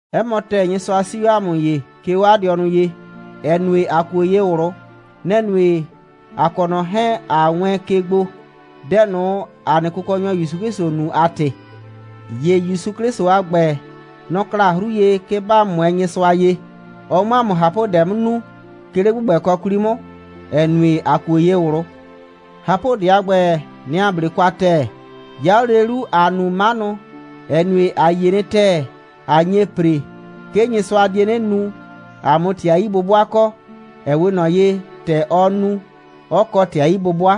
'Ɛ mɔ ‑tɛɛ, Nyɩsʋa 'sii 'o ‑a mʋ ye, 'ke 'o 'a dɩɔnʋ ye, ‑ɛ nue, ‑a kuo ye ꞊wlʋ. Nɛ‑ nue, ‑a kɔ ꞊nɔ 'hɛɛn, ꞊a wɛɛn ke gbo, dɛ ꞊nʋ, ‑a nɩ Kʋkɔnyɔ ‑Yusu 'Klɩsʋ nu a ‑tɩ. ‑Ye ‑Yusu 'Klɩsʋ a ‑gbɛ, nɔ‑ kla 'hru ye, 'ke ‑ba 'mʋɛɛ Nyɩsʋa ye, ɔ 'mʋ ‑a mʋ ꞊hapʋdɛ 'mʋ nu, 'ke 'le ‑gbʋgbɛkɔ 'kwli 'mʋ, ‑ɛ nue, ‑a kuo ye ꞊wlʋ. ꞊Hapʋdɛ a ‑gbɛ, nɛ‑ ‑a 'ble kwa ‑tɛɛ. 'Ya 'o lele 'lu, ‑aa nu 'manʋ, ‑ɛ nue, ‑a yie nɩ ‑tɛɛ, ꞊a nye ‑pre, 'ke Nyɩsʋa die 'nɩ nu, ‑a 'mʋ ‑tɩ a 'yi'bʋbʋa kɔ, ‑ɛ 'we ꞊nɔ ye, ‑tɛ ɔ nu, 'ɔ kɔ ‑tɩ a 'yi'bʋbʋa.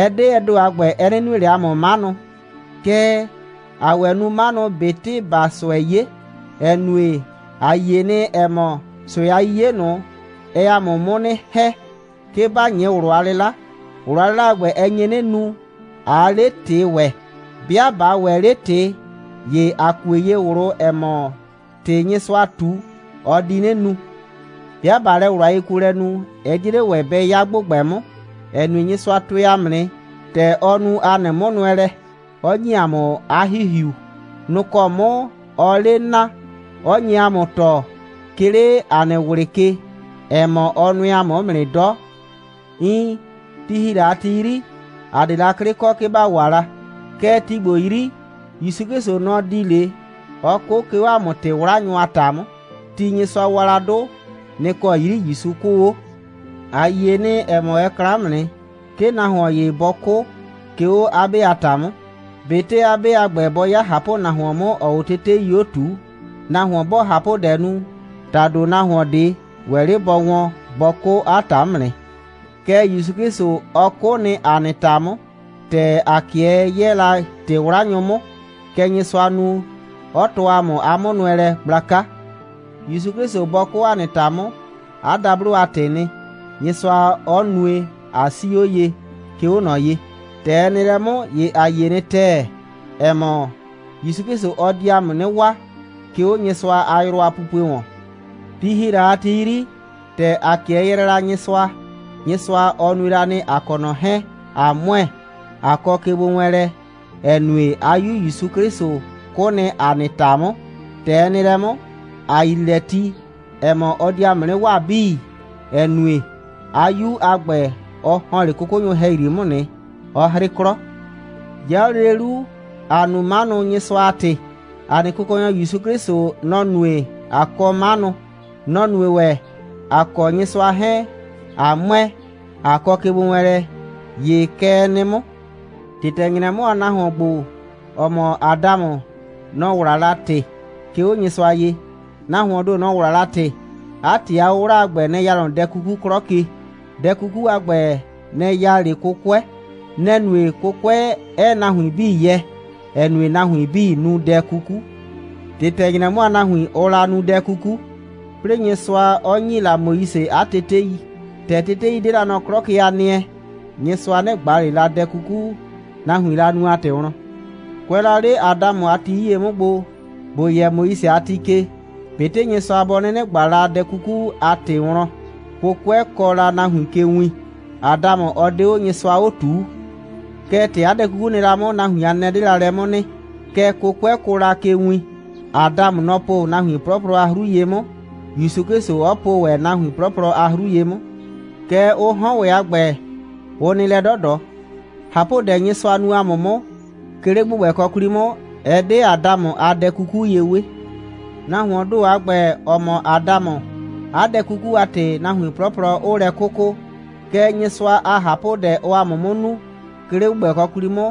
Ɛ 'de ɛ ‑do a ‑gbɛ, ɛ 'nɩ nue ꞊le ‑a mʋ 'manʋ, kɛɛ, ‑aa ‑wɛ nu 'manʋ, ꞊betɩ ‑baa ꞊sʋɛ 'ye, ‑ɛ nue, ‑a yie nɩ, ‑ɛ mɔ, ꞊sʋɛ a 'yiye ꞊nʋ, ɛɛ ‑a mʋ 'mʋ 'nɩ ‑hɛ, 'ke ‑ba 'nyɩ ꞊wlʋ a 'lɩla. ꞊Wlʋ a 'lɩla a ‑gbɛ, ɛ nye 'nɩ nu, ꞊aa 'le ‑tɩ ‑wɛ. 'Bɩa ꞊ba ‑wɛ 'le ‑tɩ, ‑ye ‑a kue ye ꞊wlʋ, ‑ɛ mɔ, ‑tɩ, Nyɩsʋa ꞊tu, ɔ di 'nɩ nu. 'Bɩa ꞊baa lɛ ꞊wlʋ a yekuolɛ nu, ɛ 'die 'le ‑wɛ bɛ 'ya ‑gbʋgbɛ 'mʋ, ‑ɛ nue, Nyɩsʋa tʋɛ ‑a mʋ nɩ, ‑tɛ ɔ nu ‑a nɩ 'mʋnʋɛlɛ, 'ɔ ‑nyi ‑a mʋ 'a ‑Hihiu. Nʋ‑ kɔ 'mʋ ɔɔ 'le naa, 'ɔ nye ‑a mʋ tɔɔ, 'ke 'le ‑a nɩ ꞊wlɩ ke, ‑ɛ mɔ, ɔ nʋɛ ‑a mʋ 'mʋ nɩ 'dɔ. Iin, ti ‑hi la a ti 'yri, ‑a 'de la 'klɩ kɔ, 'ke ‑ba wa la. Kɛɛ, ti ‑gbo 'yri, ‑Yusu 'Klɩsʋ, nɔ‑ di 'le, 'ɔ 'kʋ, 'ke 'o ‑a mʋ ‑tɩ'wlanyʋ a ‑ta 'mʋ. Ti, Nyɩsʋa wa la 'dʋ, nɩ‑ kɔ 'yri ‑Yusu 'kʋʋ 'o. ‑A yie nɩ, ‑ɛ mɔ, ɛ kla 'mʋ nɩ, 'ke nahuon ‑ye bɔ 'kʋ, 'ke 'o 'a 'be a ‑ta 'mʋ, ꞊betɩ 'a 'be a ‑gbɛ, bɔ 'ya ꞊hapʋnahuon 'mʋ, ‑ɔɔ 'o tetei 'o ꞊tuu. Nahuon 'bɔɔ ꞊hapʋdɛ nu, ‑tado nahuon ꞊de ‑wɛ 'le bɔ wɔn bɔ 'kʋ 'a ‑ta 'mʋ nɩ. Kɛɛ, ‑Yusu 'Klɩsʋ, ɔ 'kʋ nɩ ‑a nɩ ‑ta 'mʋ, ‑tɛ ‑a 'kɩɛ 'yɛɛ la ‑tɩ'wlanyʋ 'mʋ. Kɛ Nyɩsʋa nu, 'ɔ tɔɔ ‑a mʋ 'a 'mʋnʋɛlɛ gblaka. ‑Yusu 'Klɩsʋ bɔ 'kʋ ‑a nɩ ‑ta 'mʋ, 'a dablo a ‑tɩɩ nɩ, Nyɩsʋa 'ɔ nue, ꞊a 'sii 'o ye, 'ke 'o ꞊nɔ ye. ‑Tɛ ɛ nɩ lɛ 'mʋ, ‑ye ‑a yie nɩ ‑tɛɛ, ‑ɛ mɔ, ‑Yusu 'Klɩsʋ ɔ di ‑a mʋ 'nɩ waa, 'ke 'o Nyɩsʋa a yrʋ a pupue ‑wɔn. Ti ‑hi la a ti 'yri, ‑tɛ ‑a 'kɩɛ yrɛɛ la Nyɩsʋa, Nyɩsʋa, ɔ nue la nɩ, ‑a kɔ ꞊nɔ 'hɛɛn, ꞊a ‑mʋɛ, ꞊a kɔ kegbowɛɛnlɛ, ‑ɛ nue, 'a 'Yu ‑Yusu 'Klɩsʋ 'kʋ nɩ ‑a nɩ ‑ta 'mʋ. ‑Tɛ ɛ nɩ lɛ 'mʋ, ‑a yrii lɛ ti, ‑ɛ mɔ, ɔ di ‑a mʋ 'nɩ waa 'bii, ‑ɛ nue, 'a 'Yu ‑a ‑gbɛ, ɔ ‑hɔn 'le 'kʋkʋnyʋ ‑hɛyri 'mʋ nɩ, 'ɔ 'hrɩ 'klɔ. 'Ya 'o lele 'lu, ‑aa nu 'manʋ, Nyɩsʋa a ‑tɩ. ‑A nɩ Kʋkɔnyɔ ‑Yusu 'Klɩsʋ, nɔ‑ nue, ꞊a kɔ 'manʋ. Nɔ‑ nue ‑wɛ, ‑a kɔ Nyɩsʋa 'hɛɛn ꞊a ‑mʋɛ, ꞊a kɔ kegbowɛɛnlɛ. ‑Ye kɛ ɛ nɩ 'mʋ. ‑Tɩtɛ‑nyrɛ 'mʋ, nahuon ‑gbo, ‑ɔ mɔ Adamʋ, nɔ‑ 'wla la ‑tɩ, 'ke 'o Nyɩsʋa ye. Nahuoon ‑do, nɔ‑ 'wla la ‑tɩ. 'A ‑tɩ a 'wʋwla a ‑gbɛ, nɛ‑ ya nɔ dɛ 'kuku 'klɔ ke. Dɛ 'kuku a ‑gbɛ, nɛ‑ ya 'le 'kʋkʋɛ. Nɛ‑ nue, 'kʋkʋɛ 'ɛɛ nahuin 'bii yɛ, ‑ɛ nue, nahuin 'bii nu dɛ 'kuku. ‑Tɩtɛ‑nyrɛ 'mʋ, nahuin, ʋʋ la nu dɛ 'kuku, 'plɩɩ Nyɩsʋa 'ɔ ‑nyi la Moise 'a tetei. ‑Tɛ tetei 'de la nɔ 'klɔ ke a nɩɛ, Nyɩsʋa 'nɩ ꞊gba ꞊le la dɛ 'kuku, nahuiin la nu a ‑tɩ wlɔn. Kʋɛ la 'le Adamʋ a ti 'yie 'mʋ gbo, ‑bo yɛ Moise a ti ke, ꞊betɩ Nyɩsʋa bɔ 'nɩnɩ ꞊gba la dɛ 'kuku a ‑tɩ wlɔn, 'kʋkʋɛ kɔɔ la nahuin ke win. Adamʋ, ɔ 'de 'o Nyɩsʋa 'o ꞊tuu. Kɛɛ, ‑tɛ 'a dɛ 'kuku nɩ la 'mʋ, nahuin a nɛnɛ 'de la lɛ 'mʋ nɩ, kɛɛ, 'kʋkʋɛ kʋʋ la ke win. Adamʋ, nɔ‑ po nahuin 'plɔplɔ a 'hru ye 'mʋ, ‑Yusu 'Klɩsʋ 'ɔ po ‑wɛ nahuin 'plɔplɔ a 'hru ye 'mʋ. Kɛɛ, ʋ 'hɔn ‑wɛ a ‑gbɛ, ʋ nɩ lɛ 'dɔdɔ. ꞊Hapʋdɛ, Nyɩsʋa nu ‑a mʋ 'mʋ, 'ke 'le ‑gbʋgbɛkɔ 'kwli 'mʋ, ɛ 'de Adamʋ a dɛ 'kuku ye 'we. Nahuoon ‑do a ‑gbɛ, ‑ɔ mɔ Adamʋ, 'a dɛ 'kuku a ‑tɩ, nahuin 'plɔplɔ 'ʋʋ lɛ 'kʋkʋ. Kɛɛ, Nyɩsʋa a ꞊hapʋdɛ, ɔɔ ‑a mʋ 'mʋ nu, 'ke 'le ‑gbʋgbɛkɔ 'kwli 'mʋ,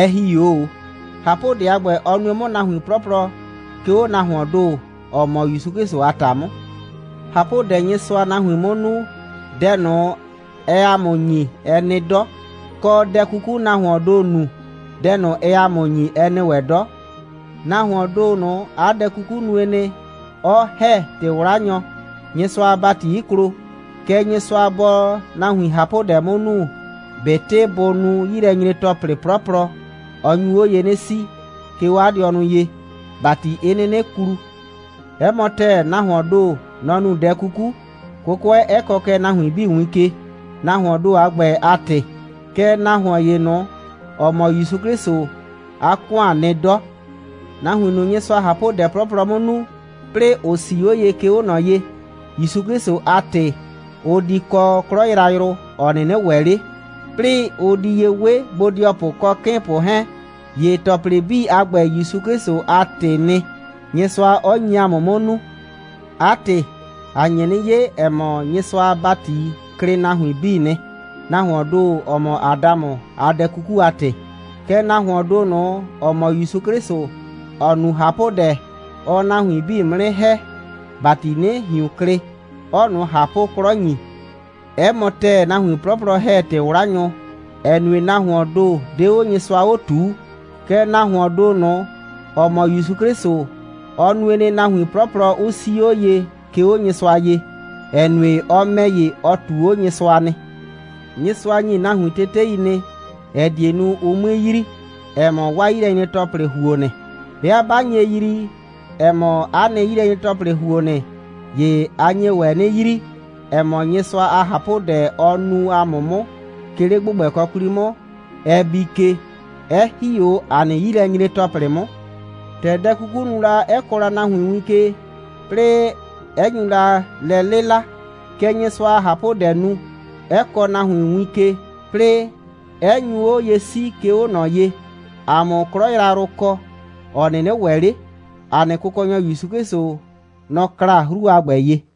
ɛ ‑hi 'o ꞊o. ꞊Hapʋdɛ a ‑gbɛ, ɔ nue 'mʋ nahuin 'plɔplɔ, 'ke 'o nahuoon ‑do, ‑ɔ mɔ ‑Yusu 'Klɩsʋ a ‑ta 'mʋ. ꞊Hapʋdɛ, Nyɩsʋaa nahuin 'mʋ nu, dɛ ꞊nʋ, ɛɛ ‑a mʋ ‑nyi, ɛ nɩ 'dɔ. Kɔ, dɛ 'kuku, nahuoon ‑do nu, dɛ ꞊nʋ, ɛɛ ‑a mʋ ‑nyi, ɛ nɩ ‑wɛ 'dɔ. Nahuoon ‑do ꞊nʋ, 'a dɛ 'kuku nue nɩ, 'ɔ ‑hɛ ‑tɩ'wlanyɔ, Nyɩsʋa a ‑bati 'ɩ klo. Kɛɛ, Nyɩsʋa 'bɔɔ nahuin ꞊hapʋdɛ 'mʋ nu, ꞊betɩ bʋ nu 'yilɛnyre‑tɔplɩ 'plɔplɔ, ɔ nyu 'o ye 'nɩ 'sii, 'ke 'o 'a dɩɔnʋ ye, ‑bati 'ɩ 'nɩnɩ klu. 'Ɛ mɔ ‑tɛɛ, nahuoon ‑do, nɔ‑ nu dɛ 'kuku, 'kʋkʋɛ 'ɛ kɔɔ kɛ nahuin 'bii win ke, nahuoon ‑do a ‑gbɛ a ‑tɩ. Kɛɛ, nahuon ‑ye ꞊nʋ, ‑ɔ mɔ ‑Yusu 'Klɩsʋ, 'a ‑kʋan nɩ 'dɔ. Nahuin ꞊nʋ, Nyɩsʋaa ꞊hapʋdɛ 'plɔplɔ 'mʋ nu, 'plɩɩ ‑ʋ 'sii 'o ye, 'ke 'o ꞊nɔ ye, ‑Yusu 'Klɩsʋ a ‑tɩ, ʋ di kɔ 'klɔ yrayrʋ, ‑ɔ 'nɩnɩ ‑wɛ 'le, 'plɩɩ ʋ di ye 'we bodɩɔpʋ kɔ 'kɩɩnpʋ 'hɛɛn. ‑Ye ‑tɔplɩ 'bii a ‑gbɛ, ‑Yusu 'Klɩsʋ a ‑tɩɩ nɩ, Nyɩsʋa 'ɔ nyi ‑a mʋ 'mʋ nu. 'A ‑tɩ, ‑a nye 'nɩ 'ye, ‑ɛ mɔ, Nyɩsʋa a ‑bati klɩ nahuin 'bii nɩ, nahuoon ‑do, ‑ɔ mɔ Adamʋ, a dɛ 'kuku a ‑tɩ. Kɛɛ, nahuoon ‑do ꞊nʋ, ‑ɔ mɔ ‑Yusu 'Klɩsʋ, ‑ɔ nu ꞊hapʋdɛ, ɔɔ nahuin 'bii 'mʋ 'nɩ ‑hɛ, ‑bati 'nɩ ꞊hiun klɩ, 'ɔɔ ꞊nʋ ꞊hapʋ'klɔ ‑nyi. 'Ɛ mɔ ‑tɛɛ, nahuin 'plɔplɔ ‑hɛ ‑tɩ'wlanyʋ, ‑ɛ nue, nahuoon ‑do 'de 'o Nyɩsʋa 'o ꞊tuu. Kɛɛ, nahuoon ‑do ꞊nʋ, ‑ɔ mɔ ‑Yusu 'Klɩsʋ, ɔ nue nɩ, nahuin 'plɔplɔ 'ʋ 'sii 'o ye, 'ke 'o Nyɩsʋa ye, ‑ɛ nue, ɔ ‑mɛ ‑ye, ɔ ꞊tuu 'o Nyɩsʋa nɩ. Nyɩsʋa ‑nyi nahuin tetei nɩ, ‑ɛ die nu, ʋ 'mue yrii, ‑ɛ mɔ, 'waa 'yilɛnyre‑tɔplɩ ‑huo nɩ. 'Bɩa ꞊ba nye yrii, ‑ɛ mɔ, ‑a nɩ 'yilɛnyre‑tɔplɩ ‑huo nɩ, ‑ye ‑a nye ‑wɛ 'nɩ yrii, ‑ɛ mɔ, Nyɩsʋa a ꞊hapʋdɛ, ɔ nu ‑a mʋ 'mʋ, 'ke 'le ‑gbʋgbɛkɔ 'kwli 'mʋ, ɛ bii ke, 'ɛ ‑hi 'o ‑a nɩ 'yilɛnyre‑tɔplɩ 'mʋ. ‑Tɛ dɛ 'kukuu la nu, 'ɛ kɔɔ la nahuin win ke, 'plɩɩ 'ɛ nyu la lɛ 'lɩla, kɛ Nyɩsʋa a ꞊hapʋdɛɛ nu, 'ɛ kɔɔ nahuin win ke, 'plɩɩ 'ɛ nyu 'o ye 'sii, 'ke 'o ꞊nɔ ye, ‑a 'mʋ 'klɔ yrayrʋ kɔ, ‑ɔ 'nɩnɩ ‑wɛ 'le. ‑A nɩ Kʋkɔnyɔ ‑Yusu 'Klɩsʋ, nɔ‑ kla 'hru a ‑gbɛ ye.